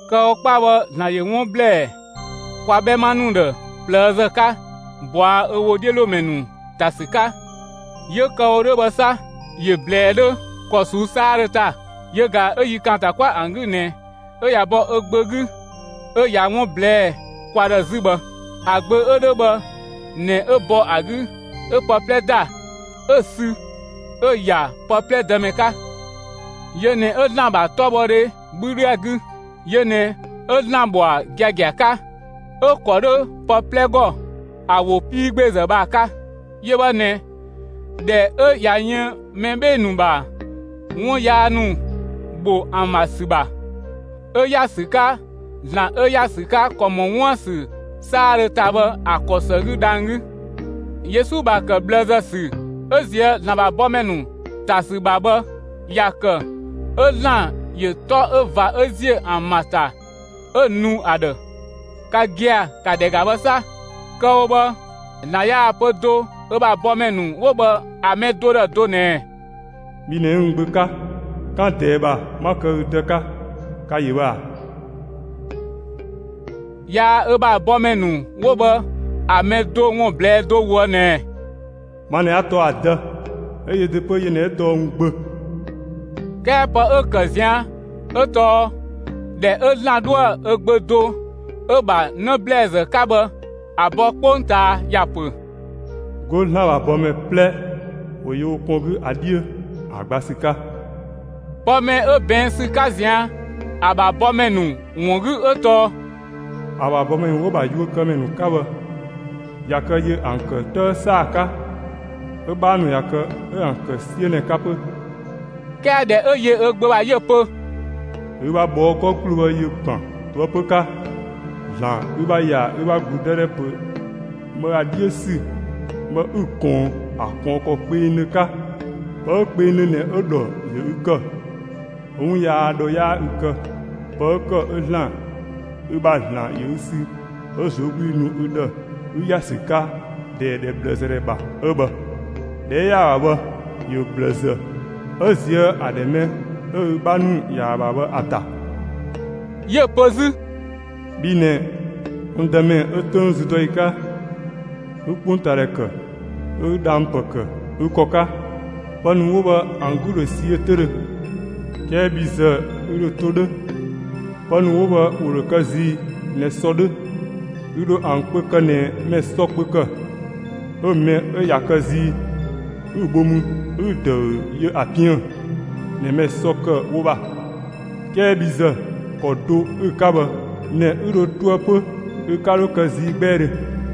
Kë‑ wo 'kpa bhë ‑Zlan ‑yö 'wun ‑blɛɛ kwa 'bhɛma ‑nu ‑dhë ꞊plëëzë 'ka ꞊bɔa' ö ‑wodhiölomɛ ‑nu ‑ta ‑sü 'ka; 'yö kë‑ wo 'dhö bhë 'sa, ‑yö ꞊blɛɛ 'dhö ‑kɔ ꞊suu'‑ 'saadhö ‑ta. Yö ꞊ga 'ö yi ‑kaanta 'kwa ‑an 'gü ꞊nɛ 'ö ꞊ya bɔ ö Gbö 'gü 'ö ꞊ya 'wun ꞊blɛɛ'‑ kwa ‑dhë 'zü bhë. ‑A Gbö 'ö 'dhö bhë ꞊nɛ 'ö bɔ ‑a 'gü 'ö pë 'plɛ ‑da, 'ö‑ sü 'ö‑ ‑ya pë 'plɛ Dëmɛ 'ka. Yö ꞊nɛ 'ö ‑Zlan ‑bha 'tɔbhɔdhe 'bhü 'dhö ‑a 'gü. Yö ꞊nɛ 'ö ‑Zlan ‑bhɔa giagia 'ka, 'ö‑ ‑kɔ 'dhö pë 'plɛ ‑gɔ ‑a ‑wo 'piigbeezë bhë ‑a 'ka. Yö bhë ꞊nɛ, ꞊dhɛ 'ö ꞊ya yën mɛ 'bhee‑ ‑nu ‑bha 'wun yaa ‑nu ‑bho ‑an ‑bha ‑sü ‑bha, 'ö ‑ya ‑sü 'ka ‑Zlan 'ö ‑ya ‑sü 'ka ‑kɔ ‑mɔ 'wuën‑ ‑sü 'saadhö ‑ta bhë ‑a ‑kɔ ‑së 'gü dhang‑ 'gü. Yesu ‑bha ‑kë ꞊bhlëzë ‑sü 'ö ꞊zië' ‑Zlan ‑bha bɔmɛ ‑nu ‑ta ‑sü ‑bha bhë, ‑ya ‑kë 'ö ‑Zlan ‑yö 'tɔ 'ö ꞊va 'ö ‑ziö ‑an ‑bha ‑ta 'ö‑ nu ‑a ‑dhë. Ka gia‑ ‑ka ‑dhɛ ‑ga bhë 'sa! Kë‑ wo bhë, ‑Zlan yaa‑ pö do ö ‑bha bɔmɛ ‑nu 'wo bhë ‑a mɛ do ‑dhë do ꞊nɛɛ: Bhi ꞊nɛ 'ü n Gbö 'ka, 'kan ꞊dɛɛ ‑bha, 'ma kë ü Dë 'ka. Ka‑ ‑yö bhë ꞊a? Yaa ö ‑bha bɔmɛ ‑nu 'wo bhë ‑a mɛ do ‑wun ꞊blɛɛ'‑ do ꞊woë' ꞊nɛɛ: Ma ꞊nɛ 'a tɔɔ ‑a Dë, 'ö yö ‑de 'pö yö ꞊nɛ 'ö tɔɔ n Gbö. 'Kɛɛ pë 'ö ‑kë ꞊zian' 'ö tɔɔ, ‑dhɛ 'ö ‑Zlan 'dhoë‑ ö Gbö do 'ö‑ ‑bha 'në ‑blɛɛzë 'ka bhë ‑a bɔ 'kpongtaa, ‑ya ‑pö: 'Go ‑Zlan ‑bha bɔmɛ 'plɛ ‑wo yö wo kpɔn 'gü ‑a 'dhiö ‑a gba ‑sü 'ka. Pë mɛ 'ö ꞊bɛɛn' ‑sü 'ka ꞊zian' ‑a ‑bha bɔmɛ ‑nu ‑wun 'gü 'ö tɔɔ: ‑A ‑bha bɔmɛ ‑nu 'wo‑ ‑bha yuökëmɛ ‑nu 'ka bhë, ꞊ya kë, ‑yö ‑an kë 'tëë ‑saa 'ka, 'ö‑ 'bhaa ‑nu ꞊ya kë, 'ö‑ ‑an ‑kë 'siö ꞊nɛ 'ka 'pö. 'Kɛɛ ꞊dhɛ 'ö yö ö Gbö ‑bha 'yö‑ pö: Ü ‑bha ꞊bhɔɔ' 'gɔ ‑gbloo bhë ‑yö ‑gban ꞊toëpö 'ka, ‑Zlan; ü ‑bha ‑ya ü ‑bha ‑gludëdhɛ ‑pö bhë ‑a 'dhiö ‑sü bhë, ü‑ ‑kɔɔn ‑a ‑kɔɔn ‑kɔ kpengdhö 'ka. Pë 'ö kpengdhö ꞊nɛ 'ö‑ ‑dhɔ ‑yö ü ‑kë; 'ö 'wun yaa ‑dhɔ 'yaa ü kë. Pë 'ö ‑kë 'ö ‑Zlan, 'ö ü ‑bha ‑Zlan ‑yö ü sü 'ö ꞊zuögludhi nu ü ‑dhë ü ‑ya ‑sü 'ka ‑dhɛ ꞊bhlëzë ‑dhɛ ‑bha 'ö bhë. ‑Dhɛ 'ö ‑ya ‑a ‑bha bhë, ‑yö ꞊bhlëzë 'ö ꞊zië' ‑a ‑dhɛ mɛ 'ö ü 'bha ‑nu ‑ya ‑a ‑bha bhë ‑a ‑ta. 'Yö‑ pö 'zü: Bhi ꞊nɛ, n Dëmɛ, 'ö 'töng züdɔyi 'ka, 'ü 'kpongtaadhɛ ‑kë; 'ö 'ü dhang‑ ‑pë ‑kë ü ‑kɔ 'ka. Pë ‑nu 'wo bhë ‑an 'gü ‑dhö ꞊siö 'töüdhö; 'kɛɛ bhi ‑zë ü ‑dhö to 'dhö. Pë ‑nu 'wo bhë ‑wo ‑dho kë zii ꞊nɛ sɔ ‑nu 'dhö; ü ‑dho ‑an kpö kë ꞊nɛ mɛ ‑sɔ kpö ‑kë, 'ö‑ mɛ 'ö ꞊ya kë zii 'ü‑ bho mü 'ü‑ ‑dëü yö ‑a piën‑ ꞊nɛ mɛ ‑sɔ ‑kë wo ‑bha. 'Kɛɛ bhi ‑zë, ‑kɔ do 'ü‑ 'ka bhë ꞊nɛ 'ü dhö toë 'pö; ü 'ka 'dho kë zii 'gbɛɛdhö.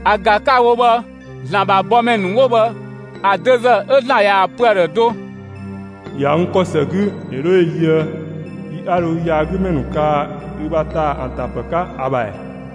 ‑A ‑ga 'ka‑ wo bhë ‑Zlan ‑bha bɔmɛ ‑nu 'wo bhë ‑a dözë 'ö ‑Zlan ꞊yaa‑ pö ‑a ‑dhë do: ‑Ya n ‑kɔ ‑së 'gü, ‑yö 'dho ‑yö yöë yi 'a dho ü yaagümɛ ‑nu kaa ü ‑bha ‑taa ‑an ‑ta ‑pë 'ka ‑a ‑bha ‑ɛ?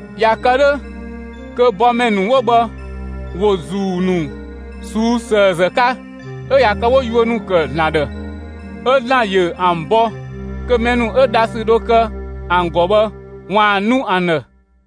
꞊Ya kë 'dhö kö bɔmɛ ‑nu 'wo bhë, ‑wo ‑zuu ‑nu ꞊suu'‑ ‑sëëzë 'ka 'ö ꞊ya kë 'wo yuö ‑nu ‑kë ‑Zlan ‑dhë; 'ö ‑Zlan ‑yö ‑an bɔ kö mɛ ‑nu 'ö dhasü dho kë ‑an ‑gɔ bhë, ‑waan nu ‑an ‑dhë.